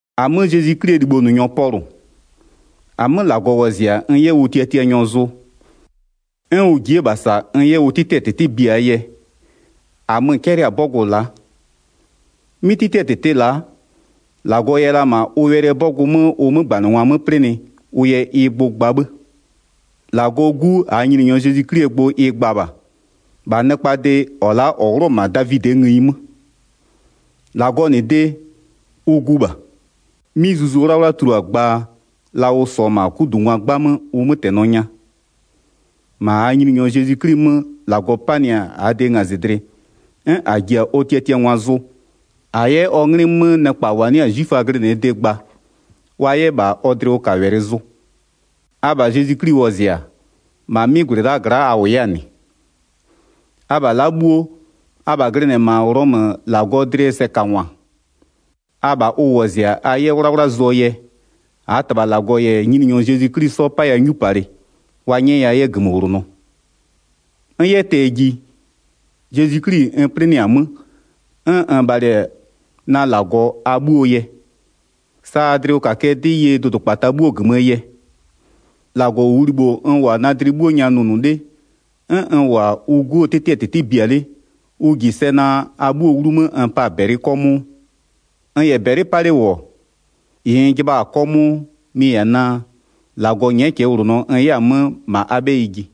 1-Amö Zezwi 'Klie libhonʋnyɔ Pɔlʋ, -amö -Lagɔ wɔzɩ-a n 'yɛ ʋ tiatianyɔ zʋ, 'n ʋ ji'i-e -bha -sa n 'yɛ ʋ 'tɩtɩɛ -tɩtɩ biaa yɛ, -amö-ö 'cɛlɩ-a 'bɔgʋ la'a. 'Mɩ 'tɩtɩɛ -tɩtɩ la'a, -Lagɔ yɛ la -ma ʋ wɛlɩɛ 'bɔgʋ 'mö ʋ 'mögbanɩngwa 'mö 'plɩnɩ ʋ yɛ ɩ gbʋ gba 'bhë. 3-Lagɔɔ 'Gu, -aa Nyininyɔ Zezwi 'Klie gbʋ ɩ gba -bha, -bha nɩkpaa de -ɔ la'a -ɔ 'wlʋ-ɔ -ma Davidɩɛ ngëyi 'mö. 4-Lagɔɔ -nɩ de, ʋ Gu -bha. 'Mɩ Zuzu 'Wlawla tulua-a gbaa, la ʋ -sɔɔ-ɔ -ma 'kudungwa 'gbamö ʋ 'mötɛnɔ nya. 5-Ma -aa Nyininyɔ Zezwi 'Kli 'mö -Lagɔ 'panɩ-a -aa de ngazɩdlɩ 'n -a ji-a ɔ tiatiangwa zʋ, -a 'yɛ ɔ 'nglɩ 'mö nɩkpa -wa 'nɩ-a 'zwiföa glɩnɩɛ de gba wa 'yɛ -bha ɔ dlɩwʋkawɛlɩ zʋ. Abha Zezwi 'Kli wɔzɩ-a, -ma 'mɩ -gwlɩ la'aa gla'a a -wʋ 'yɛ-a -nɩ. Abha la'a 'bhuo, abha glɩnɩ-ɛ -ma Ghlɔmö -Lagɔɔ dlɩɛ sɛkangwa, abha ʋ wɔzɩ-a a 'yɛ 'wlawla zʋɔ yɛ, -aa -Tɩbha -Lagɔ -yɛ Nyininyɔ Zezwi 'Kli 'sɔ 'paya 'nyupalɩ, wa 'nyɛya 'yɛ -gömöwlonɔ. N 'yɛ tɛ-ɛ ji, Zezwi 'Kli-i n 'plɩnɩ-a 'mö, 'n n bhalɩ-ɛ na -Lagɔ a 'bhuoo yɛ, sa a dlɩwʋkakɩɛ 'dɩ ye dʋdʋkpata 'bhuo -gömöö yɛ. 9-Lagɔ -ʋʋ libho n -wʋ-a na dlɩ 'bhuo nya nʋnʋ 'le, 'n n -wʋ-a ʋ 'Guo 'tɩtɩɛ -tɩtɩ bia 'le, ʋ -ji sɛ naa a 'bhuoo 'wlumö n pa-a -bɛlɩ 'kɔmʋʋ. N -yɛ -bɛlɩ 'pa 'le -wʋ-ɔ, -ɩ n jɩbha-a 'kɔmʋʋ mɩ-ɩ -yɛ-a naa -Lagɔ nyɛ'ɛ cɛɛwlonɔ n 'yɛ-a 'mö -ma a 'bhɛyɩ ji.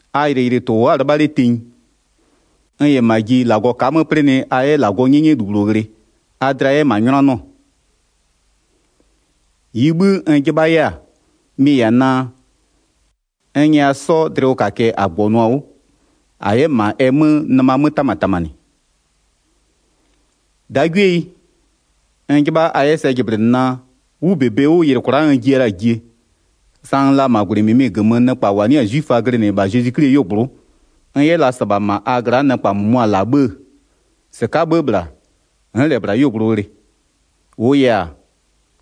A yɩlɩyɩlɩtʋ-ʋ wʋ'ʋ-a 'lɩbha 'le tenyi, n -yɛ -ma ji -Lagɔ ka'a 'mö 'plɩnɩ a 'yɛ -Lagɔɔ 'nyɛnyɛlu -bhlʋ ghlɩ, a dlɩa 'yɛ -ma 'nyʋnanɩɔ. 12-Ɩɩ 'bhï n 'jɩbha 'yɛ-a, mɩ-ɩ -yɛ-a naa, n nyɛya 'sɔ dlɩwʋkakɩɛ -a -gbɔnʋ-a 'wʋ -a 'yɛ -ma ɛ 'mö nɩma 'mö 'tamatamanɩ. 13-Dagwieyi, n 'jɩbha a 'yɛ sɛ jɩblɩnɩ naa, 'wʋ -bebe 'wʋ, yɩlɩ kwla'a n jiya la-a jie, sa n la-a -ma -gwlɩ -mɩmɩ -gömö nɩkpa -wa 'nɩ-a 'zwiföa glɩnɩ -bha Zezwi 'Klie 'yuogblʋ'ʋ, n 'yɛ la -sɩbha -ma a gla'a nɩkpa -mʋmʋa -la 'bhë-ë, -sɩka'aa 'bhë -bhla, n'n -lɛ -bhla 'yuogblʋ ghlɩ. 14-Wʋʋ yɛ-a,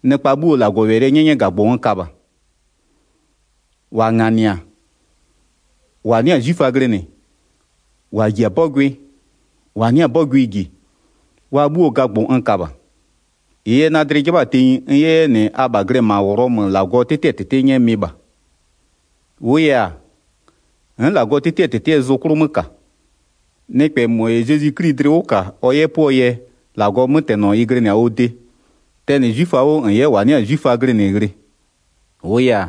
nɩkpa 'bhuoo -Lagɔwɛlɩɛ 'nyɛnyɛgagbʋ n ka -bha. -Wa -nganɩ-a, -wa 'nɩ-a 'zwiföa glɩnɩ, -wa -ji-a 'bɔgʋɩ, -wa 'nɩ-a 'bɔgʋɩ -ji, wa 'bhuoo gagbʋ n ka -bha. 15-Ɩɩ yɛ na dlɩ 'jɩbha-a tenyi n 'yɛ 'yɛ -nɩ abha glɩ-ɛ -ma Ghlɔmö -Lagɔɔ 'tɩtɩɛ -tɩtɩ 'nyɛ mɩ-ɩ -bha. 'Tɩtɩɛ -tɩtɩ -Lagɔɔ 'mötɛnɔ ɩ tulua -bha 16-Wʋʋ yɛ-a, n'n -Lagɔɔ 'tɩtɩɛ -tɩtɩɛ zʋ 'klʋ 'mö -ka. Nɩkpɛ -mɔ -yɛ Zezwi 'Kli dlɩ 'wʋ -ka ɔ 'yɛ 'pʋɔ yɛ, -Lagɔɔ 'mötɛnɔ ɩ glɩnɩ-a ɔ de, tɛnɩ 'zwiföa 'wʋ -n 'yɛ -wa 'nɩ-a 'zwiföa glɩnɩ ghlɩ. 17-Wʋʋ yɛ-a,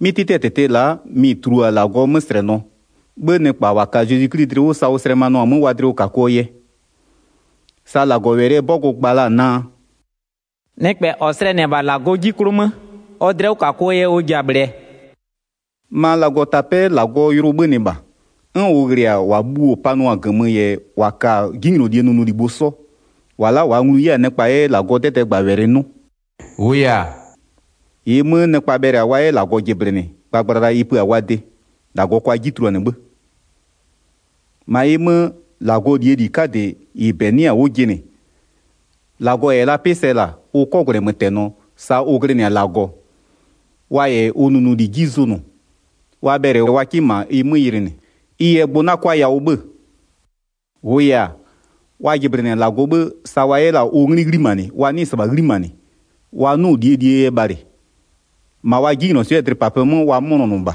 'mɩ 'tɩtɩɛ -tɩtɩ la'a, mɩ-ɩ tulua-a -Lagɔɔ 'möslɛnɔ, 'bhë nɩkpa -wa ka-a Zezwi 'Kli dlɩ 'wʋ sa ʋ slɛmanʋa-a 'mö wa dlɩwʋkakʋɔ yɛ. Sa -Lagɔwɛlɩɛ 'bɔgʋ gba la-a naa: “Nɩkpɛ -ɔ slɛnɩ-ɛ -bha -Lagɔ 'ji 'klʋ 'mö, ɔ dlɩwʋkakʋɔ yɛ ɔ ji-a -bhlɩɛ.” -Bha -Lagɔ 'ji 'klʋ nɩkpa 'bhuo gbʋ wa ka-a -gömö 18-Ma -Lagɔtapɛ'ɛ -Lagɔɔ yʋlʋ 'bhönɩ -bha, 'n ʋ ghlɩ-a -wa bhuo-o panʋ-a -gömö -yɛ -wa ka-a 'jinylolie nʋnʋlibho 'sɔ, -wa la'a -waa nglu 'yɛ-a nɩkpa 'yɛ -Lagɔɔ 'dɛdɛɛgbawɛlɩ 'nʋ. 19-Wʋʋ yɛ-a, -ɩɩ 'mö nɩkpa bhɛlɩ-a wa 'yɛ -Lagɔ -jɩblɩnɩ gbagblala ɩ pö-a wa de, -Lagɔ kʋa 'ji tuluanɩ 'bhë. 20-Ma ɩ 'mö, -Lagɔɔ -lie -li 'kadɩ -ɩ -bɛ 'nɩ-a 'wʋ jɩnɩ, -Lagɔ -yɛ la 'pɩ sɛ -la, ʋ 'kɔgwlɛmötɛnɔ, sa ʋ glɩnɩ-a -Lagɔ, wa -yɛ ʋ nʋnʋli 'ji zʋnʋ, wa bhɛlɩ wa 'kɩ -ma ɩ 'mö yɩlɩnɩ. 21Ɩ yɛ gbʋ 'na 'kʋa yawʋ 'bhö-ö. -Wʋʋ yɛ-a, wa jɩblɩnɩ-a -Lagɔ 'bhë sa wa 'yɛ la-a ʋ 'nglɩ 'ghlimanɩ, wa 'nɩɩ-ɩ -sɩbha 'ghlimanɩ, wa 'nʋ-ʋ ʋ -lie -lie yɛ bhalɩ. -Ma wa 'jinylɔswɩ'ɩɛ dlɩpapɩɛ 'mö wa 'mʋnɔnʋ -bha,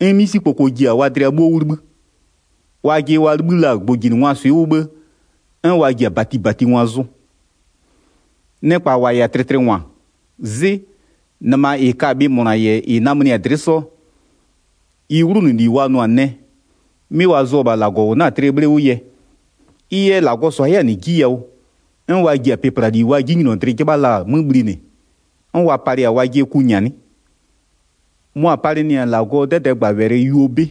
'n 'misikpoko ji-a wa dlɩa 'bhuo 'wʋ 'libhï. 22Wajɩ wa 'libhï la-a gbʋjinɩngwaa swɩ 'wʋ 'bhë, 'n wa ji-a -batibatingwa zʋ. 23Nɩkpa -wa -yɛ-a tlɩtlɩngwa, 'zɩ, nɩma -ɩ ka-a bhɩ -mʋna -yɛ ɩ namönɩ-a dlɩ'ɩ 'sɔ, ɩ 'wlʋnʋli wa nʋ-a nɛ, 'mɩ wa zʋ-ɔ -bha -Lagɔ -ʋ 'na-a tlɩɛ 'bhle 'wʋ yɛ. 24Ɩ yɛ -Lagɔ -sʋa 'yɛ-a -nɩ 'ji yawʋ, 'n wa ji-a pɩplali wa 'jinylɔdlɩ 'jɩbha la-a 'mö bhlinɩ, 'n wa palɩ-a wajɩɛ ku -nyanɩ. 25Mʋa-a palɩnɩ-a -Lagɔɔ 'dɛdɛɛgbawɛlɩ yuo 'bɩ.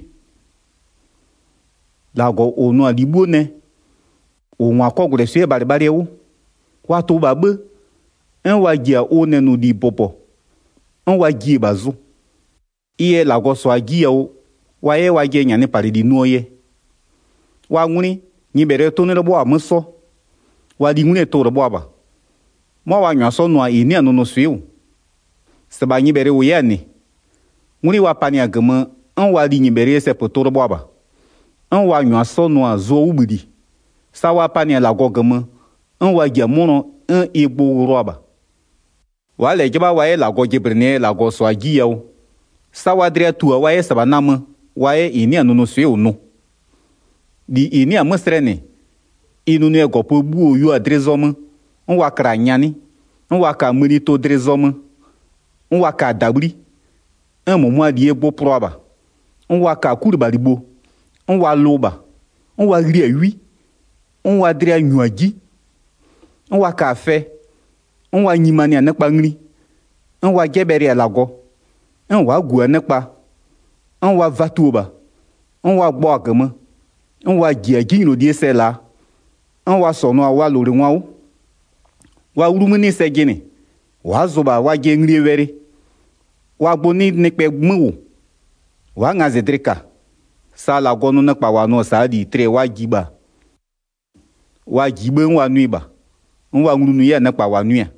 -Lagɔ -ʋ nʋ-a -li 'bhuo nɛ, -ʋ -ngwa-a 'kɔgwlɛswɩ'ɩɛ bhalɩbhalɩɛ 'wʋ, wa tʋ -bha 'bhë, 'n wa ji-a ʋ nɛnʋli bʋbɔ, 'n wa jiɩ-e -bha zʋ. 26Ɩ yɛ -Lagɔ -sʋa-a 'ji yawʋ, wa 'yɛ wajɩɛ -nyanɩpalɩli nʋɔ yɛ. Wa 'ngwlɩ, nyɩbhɛlɩɛ 'tʋ 'nɩ 'lɩbhʋa-a 'mö 'sɔ, wa lingwlɩɛ tʋ-ʋ lɩbhʋa -bha, 'mʋa wa -nyʋa 'sɔ nʋ-a -ɩ 'nɩ-a nʋnʋswɩ'ɩ -wʋ. 27-Sɩbha nyɩbhɛlɩ -wʋ 'yɛ-a -nɩ. 'Ngwlɩ wa panɩ-a -gömö, 'n wa linyɩbhɛlɩɛ sɛpötʋ lɩbhʋa -bha, 'n wa -nyʋa 'sɔ nʋ-a zʋɔ 'wʋbhïli, sa wa panɩ-a -Lagɔ -gömö, 'n wa ji-a 'mʋnɔ 'n ɩ gbʋ ghlʋa -bha. 28Wa'a -lɛ 'jɩbha wa 'yɛ -Lagɔ jɩblɩnɩɛ yɛ -Lagɔ -sʋa-a 'ji yawʋ, sa wa dlɩa tu-a wa 'yɛ -sɩbha namö, wa 'yɛ -ɩ 'nɩ-a nʋnʋswɩ'ɩ -wʋ nʋ. 29-Li -ɩ 'nɩ-a 'mö slɛnɩ, ɩ nʋnʋɛ -gɔpö bhuo-o yua-a dlɩ zɔmö, 'n wa kla-a nyanɩ, 'n wa ka-a mënitʋ dlɩ zɔmö, 'n wa ka-a -dabhli, 'n -mʋmʋaa -lie gbʋ plʋa -bha, 'n wa ka-a 'kulɩbhalibho, 'n wa lʋ -bha, 'n wa ghli-a 'wi, 'n wa dlɩa -nyu-a 'ji. 30'N wa ka-a fɛ, 'n wa nyimanɩ-a nɩkpa ngli, 'n wa 'jɛbhɛlɩ-a -Lagɔ, 'n wa'a -gu-a nɩkpa, 'n wa vatuo -bha, 'n wa gbɔ-a -gömö, 'n wa -ji-a 'jinylolie sɛ -laa, 'n wa -sɔnʋ-a wa -lowlengwa 'wʋ. 31Wa 'wlumö 'nɩ sɛ jɩnɩ, wa'a zʋ -bha wajɩɛ nglie wɛlɩ, wa gbʋ 'nɩ nɩkpɛ 'mö -wʋ, wa'a ngazɩdlɩ -ka. 32Sa -Lagɔ nʋ nɩkpa -wa nʋ-ɔ -saa -li tlɩɛ wa ji -bha, wa -jiɩ 'bhë 'n wa nʋɩ -bha, 'n wa nglunʋ 'yɛ-a nɩkpa -wa nʋɩ-a.